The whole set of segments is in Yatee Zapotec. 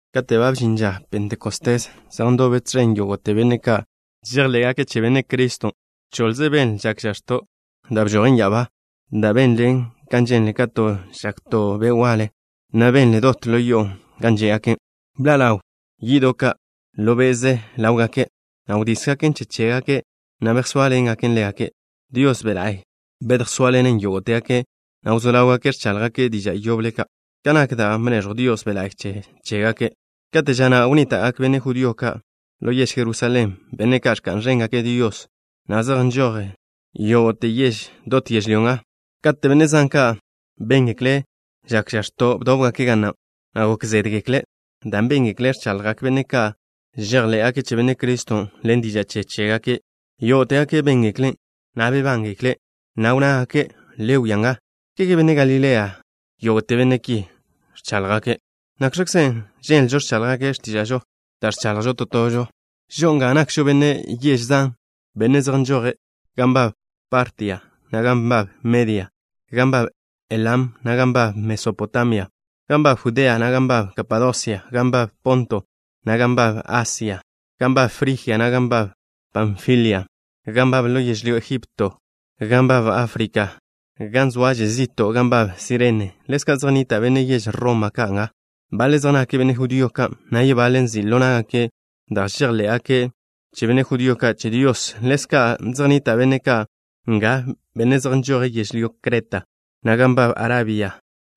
Kate' ba bžin ža Pentecostés, zej ndobe tẕen yógo'te benne' ka' žejḻé'gake' che Benne' Criston'. Choḻze benle žak žax̱to' da' bžojen ya'abá, da' benlen kan ženle kate' žak to be' waḻe, na' benlen dot ḻo yo'o gan žé'gake'. Bḻa' ḻawgak yi'do' ka' ḻo be'ze ḻáwgake', na' wdísgaken che chégake', na' bejsóaḻengaken ḻégake'. Dios Be' La'y bedjsóaḻene' yógo'tegake', na' wzó ḻáwgake' ẕcháḻjgake' diža' yoble ka', kan nak da' bneẕjw Dios Be' la'y che chégake'. Kate' ža na' wnníta'gak benne' judío ka' ḻo yež Jerusalén, benne' ka' ẕka'n ẕéngake' Dios, na' zej nžoje' yógo'te yež dot yežlyó nga. Kate' benne' zan ka' béngekle' žak žax̱ton', bdóbgake' ga na', na' gok zédgekle', dan' béngekle' ẕchaḻjgak benne' ka' žejḻé'gake' che Benne' Criston' ḻen diža' che chégake'. Yógo'tegake' béngeklen', na' bebángekle', na' wnnágake': —Le wia nga. ¿Kege benne' Galilea ka' yógo'te benne' ki ẕcháḻjgake'? ¿Nakx̱kzen' ženlžo ẕcháḻjgake' x̱tíža'žo da' ẕchaḻjžo to tožo? Žo'o nga nakžo benne' yež zan, benne' zej nžoje': Gan nbab Partia, na' gan nbab Media. Gan nbab Elam, na' gan nbab Mesopotamia. Gan nbab Judea, na' gan nbab Kapadosia. Gan nbab Ponto, na' gan nbab Asia. Gan nbab Frijia, na' gan nbab Panfilia. Gan nbab ḻo yežlyó Ejipto. Gan nbab Áfrika, gan zoaže zi'to' gan nbab Cirene. Ḻezka' zej nnita' benne' yež Roma ka' nga. Baḻe' zej nake' benne' judío ka', na' yebaḻe' nzi' ḻo ná'gake' da' žejḻe'gak benne' judío ka' che Dios. Ḻezka' zej nnita' benne' ka' nga, benne' zej nžoje' yežlyó Creta, na' gan nbab Arabia.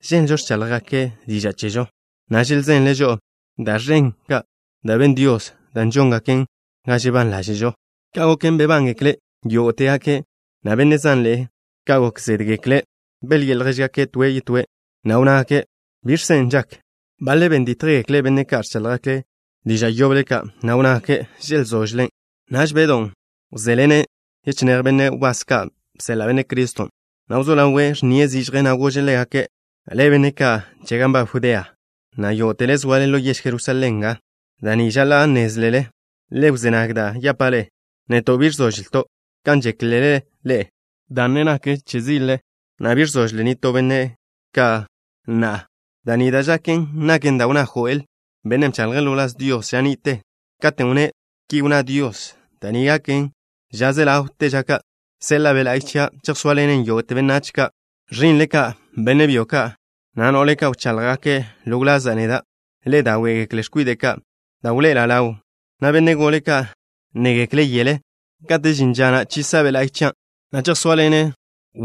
Ženlžo ẕcháḻjgake' diža' che chežo, na' želzenle' žo'o da' ẕen ka' da' ben Dios, da' žóngaken ga žebán ḻáže'žo. Ka' goken, bebángekle' yógo'tegake', na' benne' zanḻe'e ka' gok zédgekle'. Belyi'e ljéžgake' toe' yetóe', na' wnnágake': —¿Biẕkzen' da' žaken? Baḻe' ben dítjgekle' benne' ka' ẕcháḻjgake' diža' yoble ka', na' wnnágake': —Želzóžele'. Naž Bedw wzéḻene' yechinéj benne' wbás ka' bseḻa' Benne' Criston', na' wzó ḻawe' ẕnnie' zižje, na' gože' ḻégake': —Ḻe'e, benne' ka' che gan nbab Judea, na' yógo'tele zoale ḻo yež Jerusalén nga. Da' ni žaḻa' nnézlele. Le wzé nag da' yapa' ḻe'e. Neto' bi ẕzóžleto' kan žéklele ḻe'e, dan' ne zoažo x̱sile, na' bi ẕzožle nitó benne' ka na'a. Da' ni da' žaken naken dan' wnná Joel, bennen' bchaḻje' ḻo wláz Dios ža ni'te, katen' wnné': Ki wnná Dios: Da' ni gaken ža ze ḻawte ža ka'. Seḻa'a Be' La'y chia'. Chejsóaḻene' yógo'te benách ka'. Ẕi'nle ka', benne' byo ka', na' no'le ka', wcháḻjgake' ḻo wlaza' neda'. Ḻe'e dáwe'gekle x̱kwide' ka' da' wḻoe'ela' ḻaw, na' benne' gole ka' nnégekle' yele. Kate' žin ža na' chisa' Be' La'y chia', na' chejsóaḻene'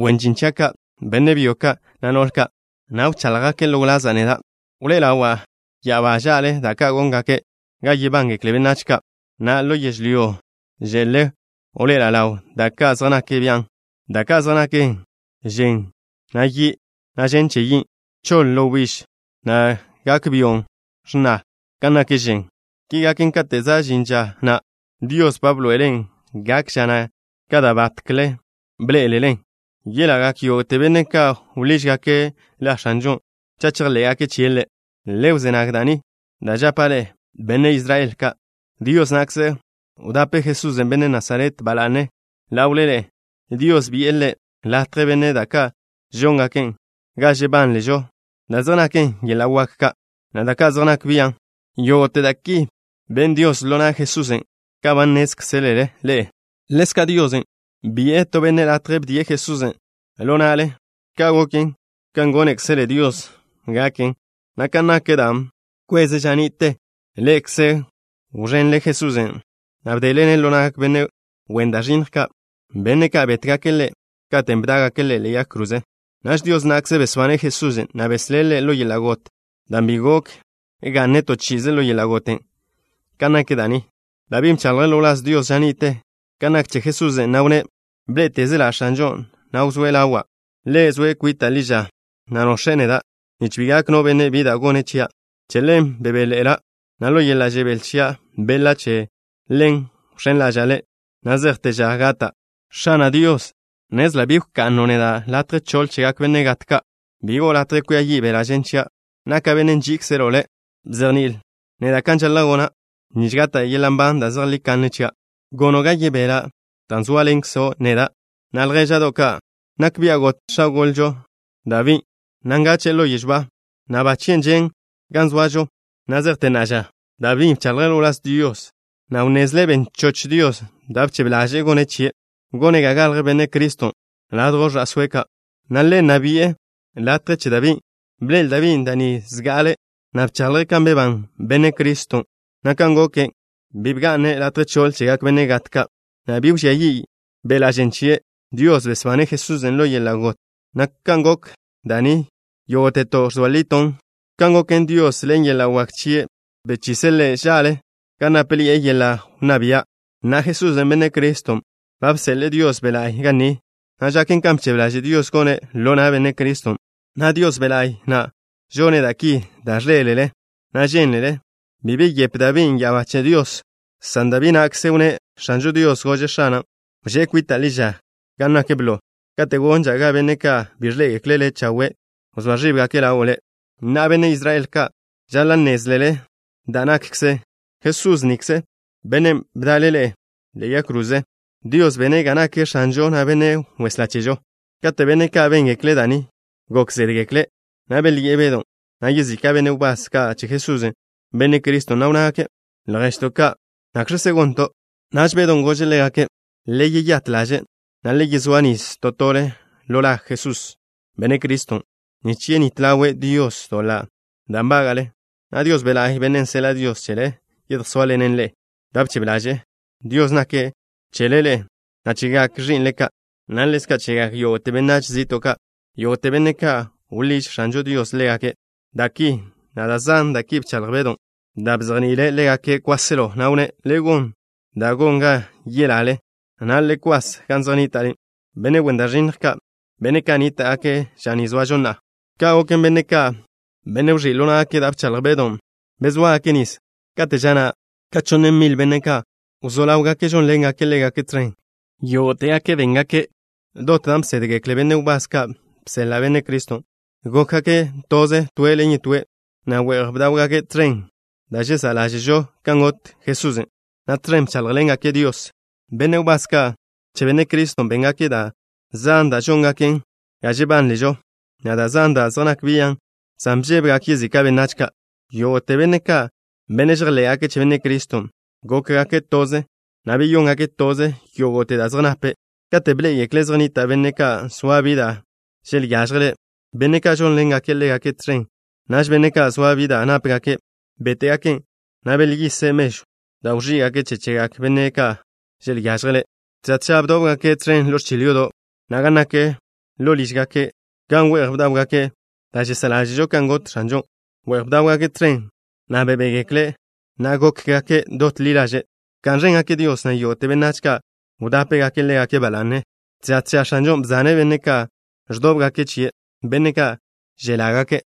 wen žin chia' ka', benne' byo ka', na' no'le ka', na' wcháḻjgake' ḻo wlaza' neda'. Wḻoe'ela' ḻaw ya'abá ža'le da' ka' góngaken ga yebángekle benách ka', na' ḻo yežlyó že'le wḻoe'ela' ḻaw da' ka' zej nak bian', da' ka' zej naken žen che we', na' yi', na' žen che yin'. Choḻ wbíž, na' gak byo' x̱na kan nak žen. Ki gaken kate' za' žin ža na' Dios ba bḻoe'elen'. Gak ža na' ka da' batkle bḻe'el-len. Yelagak yógo'te benne' ka' wḻížgake' La X̱anžon' cha' chejḻé'gake' chie' Ḻe'. ’Le wzé nag da' ni da' žapa' ḻe'e, benne' Israel ka'. Dios na'kze wdape' Jesús, benne' Nasaret, ba la'ne, ḻawle ḻe'e. Dios bi'e Ḻe' latje bene' da' ka' žóngaken ga žebán ḻáže'žo, da' zej naken yeḻa' wak ka', na' da' ka' zej nak bian'. Yógo'te da' ki ben Dios ḻo na' Jesusen', kan ba nnézkzelele ḻe'e. Ḻezka', Dios bi'e to benne' latje bdie' Jesusen' ḻo na'le. Ka' goken, kan gónekzele Dios gaken, na' kan nak da' bkweze' ža ni'te. Ḻe'ekze wẕenle Jesusen', na' bdele-ne' ḻo na'gak benne' wen da' ẕinnj ka', benne' ka' bétgake' Ḻe' katen' bdá'gake' Ḻe' ḻe'e yag kroze. Naž Dios na'kze besbane' Jesusen', na' beslé' Ḻe' ḻo yeḻa' got, dan' bi gok ga'ne' to chi'ize ḻo yeḻa' goten'. Kan nak da' ni, Dabí bchaḻje' ḻo wláz Dios ža ni'te kan nak che Jesusen', na' wnné': Bḻé'etezela' X̱anžon', na' wzóe' ḻawa'. Ḻe' zoe' kwita' ḻi ža, na' nox̱e' neda', nich bi gak no benne' bi da' gone' chia'. Che ḻen bebéḻe'ela', na' ḻo yeḻa' žebél chia' beḻa'. Che ḻen wx̱én ḻaža'a Ḻe' na' zejte ža gata'. X̱ana' Dios, nnezla' bi wka'no' neda' latje choḻ chegak benne' gat ka'. Bi go'o latje kwia yi' beḻa' žen chia'. Naka' benne' nží'ikzelo' Le'. Bzejni'ilo' neda' kan žaḻa' gona' nich gata' yeḻa' nban da' zejlí kanne chia'. Gono' ga yebela' dan' zóaḻenkzo' neda'. ’Na'a, ljéža'do' ka'. Nak bia' got x̱a gole chežo Dabín', na' bgache'e ḻo yežw ba, na' ba chien' žen' gan zoažo na' zejte na'a ža. Dabín' bchaḻje' ḻo wláz Dios, na' wnnezle' ben choch Dios da' bchebe ḻaže'e gone' chie', gone' ga galj Benne' Criston' ladjw ẕa'sóe' ka', na' Ḻe' nna bi'e latje che Dabín'. Bḻe'el Dabín' da' ni zga'ale, na' bchaḻje' kan bebán Benne' Criston', na' kan goken, bi bga'ne' latje choḻ chegak benne' gat ka', na' bi wžía yi' beḻa' žen chie'. Dios besbane' Jesusen' ḻo yeḻa' got, na' kan gok da' ni yógo'teto' ẕzoa lito' chen. Ka' goken, Dios, ḻen yeḻa' wak chie', bchise' Ḻe' ža'le gan nápeḻi'e yeḻa' wnná bia'. Na'a, Jesusen', Benne' Criston', ba bseḻe'e Dios Be' La'y ga ni, na' žaken kan bchebe ḻaže' Dios gone' ḻo na' Benne' Criston', na' Dios Be' La'y na' žone' da' ki da' ẕḻé'elele, na' žénlele. Bi beyepe Dabín' ya'abá che Dios, san Dabí na'kzen' wnné': X̱anžo Dios gože' X̱ana': “Wžé' kwita' ḻi ža gan nak blo kate' gonža' ga benne' ka' bi ẕḻé'egekle' Le' chawe' wzóa ẕíbgake' ḻawo' Le'.” ’Na'a, benne' Israel ka', žaḻa' nnézlele da' nakkzen. Jesús nikze, Bennen' bda'le-ne' ḻe'e yag kroze, Dios bene' ga nake' X̱anžo, na' Benne' Weslá chežo. Kate' benne' ka' béngekle' da' ni, gok zédgekle', na' belyi'e Bedon', na' yezika' benne' wbás ka' che Jesús, Benne' Criston', na' wnnágake': —Lježto' ka', ¿nakx̱kzen' gonto'? Naž Bedon' gože' ḻégake': —Le yeyát ḻaže', na' le yezóa nis to tole ḻo la Jesús, Benne' Criston', nich yenít ḻaw Dios doḻa' da' nbága'le, na' Dios Be' La'y, Bennen' seḻa' Dios chele, yedjsóaḻene' ḻe'e. Da' bchebe ḻaže' Dios naken chele ḻe'e, na' chegak ẕi'nle ka', na' ḻezka' chegak yógo'te benách zi'to' ka', yógo'te benne' ka' wḻíž X̱anžo Dios ḻégake'. Da' ki, na' da' zan da' ki bchaḻj Bedon', da' bzejni'ile' ḻégake' kwáselo, na' wnné': —Le gon da' gon ga yelale, na' le kwas gan zej nnita' benne' wen da' ẕinnj ka', benne' ka' nníta'gake' ža ni zoažo na'a. Ka' goken, benne' ka', benne' wẕí' ḻo ná'gake' da' bchaḻj Bedon', bezóagake' nis. Kate' ža na' ka chonn mil benne' ka' wzó ḻáwgake' žónḻengake' ḻégake' tẕen. Yógo'tegake' béngake' dot da' bsédgekle benne' wbás ka' bseḻa' Benne' Criston'. Gókgake' toze toe' ḻen yetóe', na' we'j bdáwgake' tẕen da' žesá' ḻáže'žo kan got Jesusen', na' tẕen bcháḻjḻengake' Dios. Benne' wbás ka' che Benne' Criston' béngake' da' zan da' žóngaken ga žebán ḻáže'žo, na' da' zan da' zej nak bian', san bžébegak yezika' benách ka'. Yógo'te benne' ka', benne' žejḻé'gake' che Benne' Criston', gókgake' toze, na' beyóngake' toze yógo'te da' zej nape'. Kate' bḻé'egekle' zej nnita' benne' ka' zoa bi da' želyážjele', benne' ka' žónḻengake' ḻégake' tẕen, naž benne' ka' zoa bi da' nápegake', béte'gaken', na' belyise' mežwn' da' wẕí'gake' che chegak benne' ka' želyážjele'. Tža tža bdóbgake' tẕen ḻo ẕchil yodo', na' gan nak ḻo lížgake' ka' gan we'j bdáwgake' da' žesá' ḻáže'žo kan got X̱anžon'. We'j bdáwgake' tẕen, na' bebégekle', na' gókgake' dot ḻi ḻaže'. Bka'n ẕéngake' Dios, na' yógo'te benách ka' wdápegake' ḻégake' ba la'ne. Tža tža X̱anžon' bzane' benne' ka' ẕdóbgake' chie', benne' ka' želágake'.